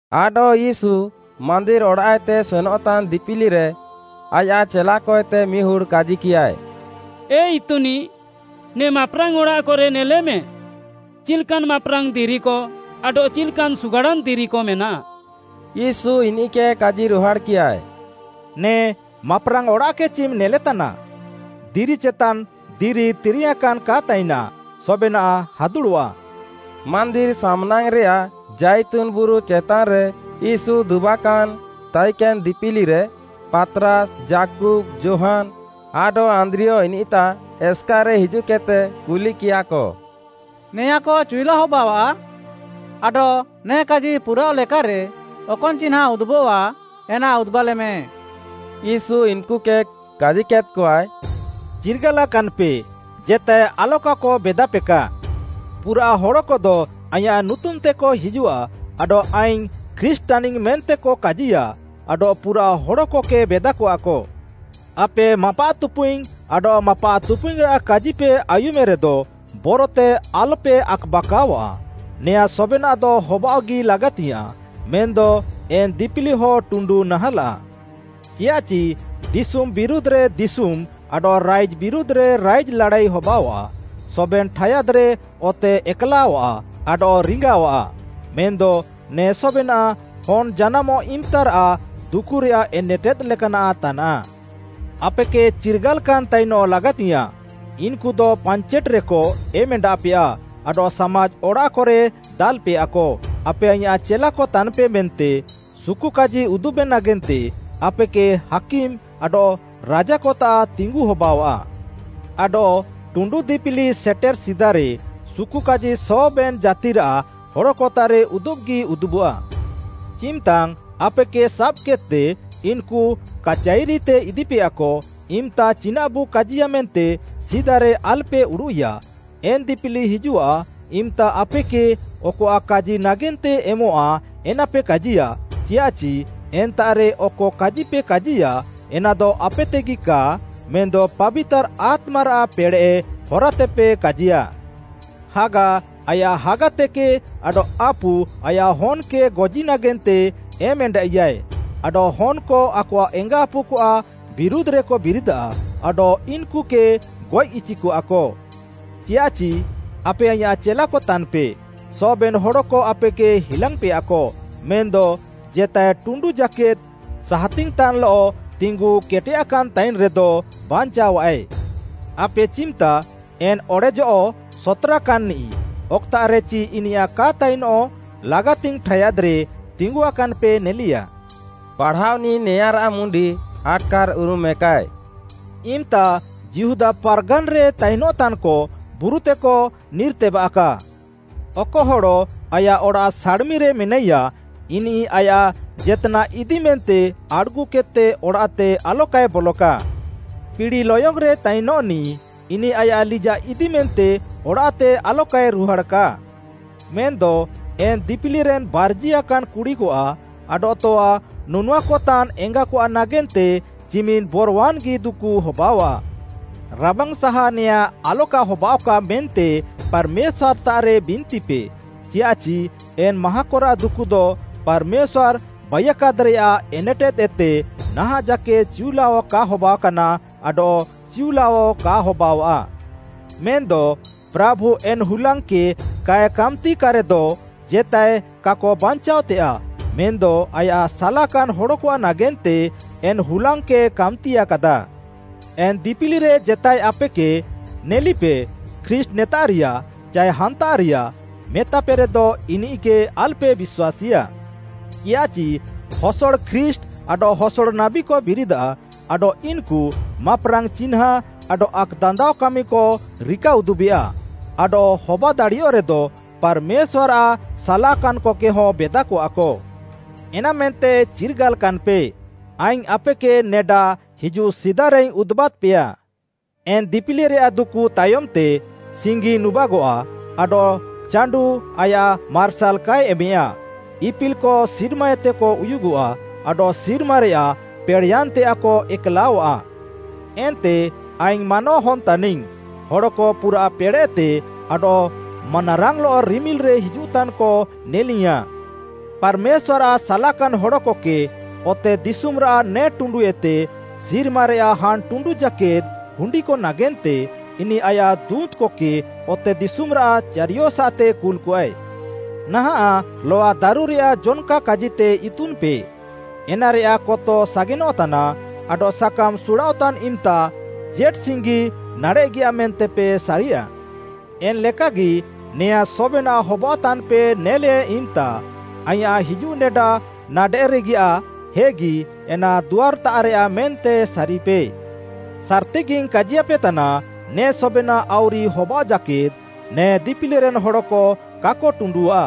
ଆଡଃ ୟୀଶୁ ମାନ୍ଦିର୍‌ ଅଡ଼ାଃଏତେ ସେନଃତାନ୍‌ ଦିପିଲିରେ ଆୟାଃ ଚେଲାକଏତେ ମିହୁଡ଼୍‌ କାଜିକିୟାଏ, “ଏ ଇତୁନିଃ, ନେ ମାପ୍‌ରାଙ୍ଗ୍‌ ଅଡ଼ାଃକରେ ନେଲେମେ, ଚିଲ୍‌କାନ୍‌ ମାପ୍‌ରାଙ୍ଗ୍‌ ଦିରିକ ଆଡଃ ଚିଲ୍‌କାନ୍‌ ସୁଗାଡ଼ାନ୍‌ ଦିରିକ ମେନାଃ।” ୟୀଶୁ ଇନିଃକେ କାଜିରୁହାଡ଼୍‌କିୟା, “ନେ ମାପ୍‌ରାଙ୍ଗ୍‌ ଅଡ଼ାଃକ ଚିମ୍‌ ନେଲେତାନା? ଦିରି ଚେତାନ୍‍ ଦିରି ତିରିୟାଁକାନ୍‍ କା ତାଇନା, ସବେନାଃ ହାଦୁଡ଼ଃଆ।” ମାନ୍ଦିର୍‌ ସାମ୍‌ନାଙ୍ଗ୍‌ରେଆଃ ଜାଇତୁନ୍‌ ବୁରୁ ଚେତାନ୍‌ରେ ୟୀଶୁ ଦୁବାକାନାଏ ତାଇକେନ୍‌ ଦିପିଲିରେ, ପାତ୍‌ରାସ୍‌, ଯାକୁବ୍‌, ଯୋହାନ୍‌ ଆଡଃ ଆନ୍ଦ୍ରିୟ ଇନିଃତାଃ ଏସ୍‌କାର୍‌ରେ ହିଜୁଃକେଦ୍‌ତେକ କୁଲିକିୟା, “ନେଆଁଁକ ଚିଉଲା ହବାଅଆଃ? ଆଡଃ ନେ କାଜି ପୁରାଅଃଲେକାରେ ଅକନ୍‌ ଚିହ୍ନାଁ ଉଦୁବଃଆ ଏନା ଉଦୁବାଲେମେ।” “ୟୀଶୁ ଇନ୍‌କୁକେ କାଜିୟାଦ୍‌କଆଏ, ଚିର୍ଗାଲାକାନ୍‍ପେ, ଜେତାଏ ଆଲକାକ ବେଦାପେକା। ପୁରାଃ ହଡ଼କଦ ଆଇଁୟାଃ ନୁତୁମ୍‍ତେକ ହିଜୁଃଆ ଆଡଃ ‘ଆଇଙ୍ଗ୍‌ ଖ୍ରୀଷ୍ଟ୍‌ ତାନିଙ୍ଗ୍‌’ ମେନ୍ତେକ କାଜିୟା ଆଡଃ ପୁରାଃ ହଡ଼କକେ ବେଦାକଆକ। ଆପେ ମାପାଃତୁପୁଇଙ୍ଗ୍‌ ଆଡଃ ମାପାଃତୁପୁଇଙ୍ଗ୍‌ରାଃ କାଜିପେ ଆୟୁମେରେଦ ବରତେ ଆଲ୍‌ପେ ଆକ୍‌ବାକାଅଆଃ, ନେଆଁଁ ସବେନାଃଦ ହବାଅଃଗି ଲାଗାତିୟାଃଁ, ମେନ୍‌ଦ ଏନ୍‌ ଦିପିଲିହ ଟୁଣ୍ଡୁ ନାହାଁଲାଃ। ଚିୟାଃଚି ଦିଶୁମ୍‌ ବିରୁଧ୍‌ରେ ଦିଶୁମ୍‌ ଆଡଃ ରାଇଜ୍‌ ବିରୁଧ୍‌ରେ ରାଇଜ୍‌ ଲାଡ଼ାଇ ହବାଅଆଃ, ସବେନ୍‌ ଠାୟାଦ୍‌ରେ ଅତେ ଏକ୍‌ଲାଅଃଆ ଆଡଃ ରିଙ୍ଗାଅଃଆ। ମେନ୍‌ଦ ନେ ସବେନାଃ ହନ୍‌ ଜାନାମଃ ଇମ୍‌ତାରାଃ ଦୁକୁରେୟାଃ ଏନେଟେଦ୍‌ ଲେକାନାଃ ତାନାଃ। “ଆପେକେ ଚିର୍ଗାଲାକାନ୍‌ ତାଇନଃ ଲାଗାତିୟାଃଁ, ଇନ୍‌କୁଦ ପାଞ୍ଚେଟ୍‌କରେକ ଏମ୍‌ଏଣ୍ଡାଃପେୟା ଆଡଃ ସାମାଜ୍‌ ଅଡ଼ାଃକରେ ଦାଲ୍‌ପେୟାକ। ଆପେ ଆଇଁୟାଃ ଚେଲାକ ତାନ୍‌ପେ ମେନ୍ତେ, ସୁକୁକାଜି ଉଦୁବେ ନାଗେନ୍ତେ ଆପେକେ ହାକିମ୍ ଆଡଃ ରାଜାକତାଃ ତିଙ୍ଗୁ ହବାଅଆଃ। ଆଡଃ ଟୁଣ୍ଡୁ ଦିପିଲି ସେଟେର୍‌ ସିଦାରେ ସୁକୁକାଜି ସବେନ୍‌ ଜାତିରାଃ ହଡ଼କତାଃରେ ଉଦୁବ୍‌ଗି ଉଦୁବଃଆ। ଚିମ୍‌ତାଙ୍ଗ୍‌ ଆପେକେ ସାବ୍‌କେଦ୍‌ତେ ଇନ୍‌କୁ କାଚାଇରିତେ ଇଦିପେୟାକ, ଇମ୍‌ତା ଚିନାଃବୁ କାଜିୟା ମେନ୍ତେ ସିଦାରେ ଆଲ୍‌ପେ ଉଡ଼ୁଃଇୟା ଏନ୍‌ ଦିପିଲି ହିଜୁଃଆ ଇମ୍‌ତା ଆପେକେ ଅକଆଃ କାଜି ନାଗେନ୍ତେ ଏମଃଆ ଏନାପେ କାଜିୟା। ଚିୟାଃଚି ଏନ୍ତାଃରେ ଅକ କାଜିପେ କାଜିୟା ଏନାଦ ଆପେତେଗି କା, ମେନ୍‌ଦ ପାବିତାର୍‌ ଆତ୍ମାରାଃ ପେଡ଼େଃ ହରାତେପେ କାଜିୟା। ହାଗା ଆୟାଃ ହାଗାତେକେ ଆଡଃ ଆପୁ ଆୟାଃ ହନ୍‌କେ ଗଜି ନାଗେନ୍ତେ ଏମ୍‌ଏଣ୍ଡାଇଆଃଏ, ଆଡଃ ହନ୍‌କ ଆକଆଃ ଏଙ୍ଗାଆପୁକଆଃ ବିରୁଧ୍‌ରେକ ବିରିଦାଃ ଆଡଃ ଇନ୍‌କୁକେ ଗଏଃ ଇଚିକଆକ। ଚିୟାଃଚି ଆପେ ଆଇଁୟାଃ ଚେଲାକ ତାନ୍‌ପେ ସବେନ୍‌ ହଡ଼କ ଆପେକେ ହିଲାଙ୍ଗ୍‌ପେୟାକ, ମେନ୍‌ଦ ଜେତାଏ ଟୁଣ୍ଡୁ ଜାକେଦ୍‌ ସାହାତିଙ୍ଗ୍‌ତାନ୍‌ଲଃ ତିଙ୍ଗୁ କେଟେୟାକାନ୍ ତାଇନ୍‌ରେଦ ବାଞ୍ଚାଅଃଆଏ। “ଆପେ ଚିମ୍‌ତା, ‘ଏନ୍‌ ଅଡ଼େଜଃ ସତ୍‌ରାକାନ୍‌ନିଃ’ ଅକ୍‌ତାଃରେଚି ଇନିୟାଃ କା ତାଇନଃ ଲାଗାତିଙ୍ଗ୍‌ ଠାୟାଦ୍‌ରେ ତିଙ୍ଗୁଆକାନ୍‍ପେ ନେଲିୟା।” ପାଢ଼ାଅନିଃ ନେଆଁଁରାଃ ମୁଣ୍ଡି ଆଟ୍‌କାର୍‍ଉରୁମେକାଏ, ଇମ୍‌ତା ଯିହୁଦା ପାର୍‌ଗାନ୍‌ରେ ତାଇନଃତାନ୍‌କ ବୁରୁତେକ ନିର୍‌ତେବାଃକା। ଅକ ହଡ଼ ଆୟାଃ ଅଡ଼ାଃ ସାଡ଼୍‌ମିରେ ମେନାଇୟାଃ ଇନିଃ ଆୟାଃ ଜେତ୍‌ନାଃ ଇଦିମେନ୍ତେ ଆଡ଼୍‌ଗୁକେଦ୍‌ତେ ଅଡ଼ାଃତେ ଆଲକାଏ ବଲଃକା। ପିଡ଼ି ଲୟଙ୍ଗ୍‌ରେ ତାଇନ୍‌ନିଃ, ଇନିଃ ଆୟାଃ ଲିଜାଃ ଇଦିମେନ୍ତେ ଅଡ଼ାଃତେ ଆଲକାଏ ରୁହାଡ଼୍‌କା। ମେନ୍‌ଦ ଏନ୍‍ ଦିପିଲିରେନ୍‌ ବାର୍ଜିଆକାନ୍‍ କୁଡ଼ିକଆଃ ଆଡଃ ତଆ ନୁନୁଆକତାନ୍‍ ଏଙ୍ଗାକଆଃ ନାଗେନ୍ତେ ଚିମିନ୍‌ ବରୱାନ୍‌ଗି ଦୁକୁ ହବାଅଆଃ। ରାବାଙ୍ଗ୍‌ସାହା ନେଆଁଁ ଆଲକା ହବାଅଃକା ମେନ୍ତେ ପାର୍‌ମେଶ୍ୱାର୍‌ତାଃରେ ବିନ୍ତିପେ, ଚିୟାଃଚି ଏନ୍‌ ମାହାଁକରାଃ ଦୁକୁଦ ପାର୍‌ମେଶ୍ୱାର୍‌ ବାଇୟାକାଦ୍‌ରେଆଃ ଏନେଟେଦ୍‌ଏତେ ନାହାଁଃ ଜାକେଦ୍‌ ଚିଉଲାଅ କା ହବାକାନା ଆଡଃ ଚିଉଲାଅ କା ହବାଅଆଃ। ମେନ୍‌ଦ ପ୍ରାଭୁ ଏନ୍‌ ହୁଲାଙ୍ଗ୍‌କକେ କାଏ କାମ୍‌ତିକାରେଦ ଜେତାଏ କାକ ବାଞ୍ଚାଅଃତେୟାଃ, ମେନ୍‌ଦ ଆୟାଃ ସାଲାକାନ୍‍ ହଡ଼କଆଃ ନାଗେନ୍ତେ ଏନ୍‍ ହୁଲାଙ୍ଗ୍‌କକେ କାମ୍‌ତିୟାକାଦା। “ଏନ୍‌ ଦିପିଲିରେ ଜେତାଏ ଆପେକେ, ‘ନେଲିପେ, ଖ୍ରୀଷ୍ଟ୍‌ ନେତାଃରିୟା’ ଚାଏ ‘ହାନ୍ତାଃରିୟା,’ ମେତାପେରେଦ ଇନିଃକେ ଆଲ୍‌ପେ ବିଶ୍ୱାସୀଆ। ଚିୟାଃଚି ହସଡ଼ ଖ୍ରୀଷ୍ଟ୍‌ ଆଡଃ ହସଡ଼ ନାବୀକ ବିରିଦାଃ ଆଡଃ ଇନ୍‌କୁ ମାପ୍‌ରାଙ୍ଗ୍‌ ଚିହ୍ନାଁ ଆଡଃ ଆକ୍‌ଦାନ୍ଦାଅ କାମିକ ରିକାଉଦୁବେଆ, ଆଡଃ ହବାଦାଡ଼ିୟଃରେଦ ପାର୍‌ମେଶ୍ୱାର୍‌ଆଃ ସାଲାକାନ୍‍କକେହଁ ବେଦାକଆକ। ଏନାମେନ୍ତେ ଚିର୍ଗାଲାକାନ୍‌ପେ, ଆଇଙ୍ଗ୍‌ ଆପେକେ ନେଡା ହିଜୁଃ ସିଦାରେଇଙ୍ଗ୍‌ ଉଦୁବାଦ୍‌ପେୟା। “ଏନ୍‌ ଦିପିଲିରେୟାଃ ଦୁକୁ ତାୟମ୍‌ତେ, ସିଙ୍ଗି ନୁବାଗଃଆ, ଆଡଃ ଚାଣ୍ଡୁଃ ଆୟାଃ ମାର୍ସାଲ୍ କାଏ ଏମେୟା, ଇପିଲ୍‌କ ସିର୍ମାଏତେକ ଉୟୁଗଃଆ, ଆଡଃ ସିର୍ମାରେୟାଃ ପେଡ଼େଃୟାନ୍‌ତେୟାଃକ ଏକ୍‌ଲାଅଃଆ। ଏନ୍ତେ ଆଇଙ୍ଗ୍‌ ମାନୱାହନ୍‌ ତାନିଙ୍ଗ୍‌ ହଡ଼କ ପୁରାଃ ପେଡ଼େଃତେ ଆଡଃ ମାନାରାଙ୍ଗ୍‌ଲଃ ରିମିଲ୍‌ରେ ହିଜୁଃତାନ୍‌କ ନେଲିଙ୍ଗ୍‌ୟାଁଃ। ପାର୍‌ମେଶ୍ୱାର୍‌ଆଃ ସାଲାକାନ୍ ହଡ଼କକେ ଅତେଦିଶୁମ୍‌ରାଃ ନେ ଟୁଣ୍ଡୁଏତେ ସିର୍ମାରେୟାଃ ହାନ୍‌ ଟୁଣ୍ଡୁ ଜାକେଦ୍‌ ହୁଣ୍ଡିକ ନାଗେନ୍ତେ ଇନିଃ ଆୟାଃ ଦୁଁତ୍‌କକେ ଅତେଦିଶୁମ୍‌ରାଃ ଚାରିୟସାଃତେ କୁଲ୍‌କଆଏ। “ନାହାଁଃ ଲଆଦାରୁରେଆଃ ଜନ୍‌କା କାଜିତେ ଇତୁନ୍‌ପେ, ଏନାରେୟାଃ କତ ସାଗେନଃତାନ୍‌ ଆଡଃ ସାକାମ୍‌ ସୁଡ଼ାଅଃତାନ୍‌ ଇମ୍‌ତା ଜେଟ୍‌ସିଙ୍ଗି ନାଡ଼େଃଗିଆ ମେନ୍ତେପେ ସାରିୟା। ଏନ୍‌ଲେକାଗି, ନେଆଁଁ ସବେନାଃ ହବାଅଃତାନ୍‌ପେ ନେଲେ ଇମ୍‌ତା, ଆଇଁୟାଃ ହିଜୁଃନେଡା ନାଡ଼େଃରେଗିଆଃ, ହେଗି ଏନା ଦୁଆର୍‌ତାଃରେୟାଃ ମେନ୍ତେ ସାରିପେ। ସାର୍‌ତିଗିଙ୍ଗ୍‌ କାଜିୟାପେତାନା ନେ ସବେନାଃ ଆଉରି ହବାଅଃ ଜାକେଦ୍‌ ନେ ଦିପିଲିରେନ୍‌ ହଡ଼କ କାକ ଟୁଣ୍ଡୁଃଆ।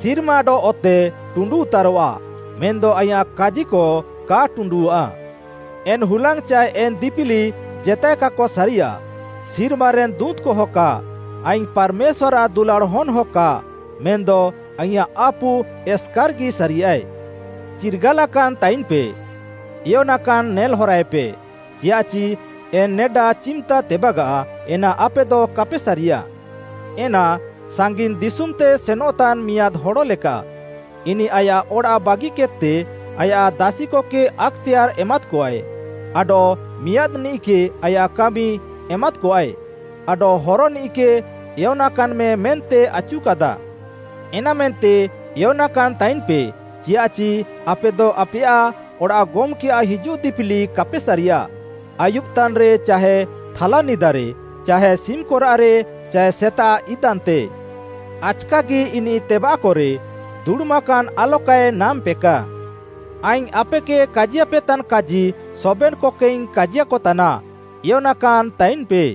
ସିର୍ମା ଆଡଃ ଅତେ ଟୁଣ୍ଡୁଉତାରଃଆ, ମେନ୍‌ଦ ଆଇଁୟାଃ କାଜିକ କା ଟୁଣ୍ଡୁଃଆ। “ଏନ୍‌ ହୁଲାଙ୍ଗ୍‌ ଚାଏ ଏନ୍‌ ଦିପିଲି ଜେତାଏ କାକ ସାରିଆଃ, ସିର୍ମାରେନ୍‌ ଦୁଁତ୍‌କହ କା, ଆଇଙ୍ଗ୍‌ ପାର୍‌ମେଶ୍ୱାର୍‌ଆଃ ଦୁଲାଡ଼୍‌ ହନ୍‌ହ କା, ମେନ୍‌ଦ ଆଇଁୟାଃ ଆପୁ ଏସ୍‌କାର୍‌ଗି ସାରିଆଃଏ। ଚିର୍ଗାଲାକାନ୍‌ତାଇନ୍‌ପେ, ଏୟନାକାନ୍ ନେଲ୍‌ହରାଏପେ, ଚିୟାଃଚି ଏନ୍‌ ନେଡା ଚିମ୍‌ତା ତେବାଗାଃ ଏନା ଆପେଦ କାପେ ସାରିୟା। ଏନା ସାଙ୍ଗିନ୍‌ ଦିଶୁମ୍‌ତେ ସେନଃତାନ୍‌ ମିଆଁଦ୍‌ ହଡ଼ଲେକା। ଇନିଃ ଆୟାଃ ଅଡ଼ାଃ ବାଗିକେଦ୍‌ତେ ଆୟାଃ ଦାସିକକେ ଆକ୍‌ତେୟାର୍‌ ଏମାଦ୍‌କଆଏ, ଆଡଃ ମିଆଁଦ୍‌ନିଃକେ ଆୟାଃ କାମି ଏମାଦ୍‌କଆଏ, ଆଡଃ ହରନିଃକେ ଏୟନାକାନ୍‌ମେ ମେନ୍ତେ ଆଚୁକାଦା। ଏନାମେନ୍ତେ ଏୟନାକାନ୍‍ତାଇନ୍‌ପେ, ଚିୟାଃଚି ଆପେଦ ଆପେୟାଃ ଅଡ଼ାଃ ଗମ୍‌କେଆଃ ହିଜୁଃ ଦିପିଲି କାପେ ସାରିୟା, ଆୟୁବ୍‌ତାନ୍‌ରେ, ଚାହେ ଥାଲାନିଦାରେ, ଚାହେ ସିମ୍‌କରାଃରେ, ଚାଏ ସେତାଃ ଇଦାନ୍‌ତେ। ଆଚ୍‌କାଗି ଇନିଃ ତେବାଃକଃରେ ଦୁଡ଼ୁମାକାନ୍‌ ଆଲକାଏ ନାମ୍‌ପେକା। ଆଇଙ୍ଗ୍‌ ଆପେକେ କାଜିୟାପେତାନ୍ କାଜି ସବେନ୍‌କକେଇଙ୍ଗ୍‌ କାଜିୟାକତାନା, ଏୟନାକାନ୍ ତାଇନ୍‌ପେ।”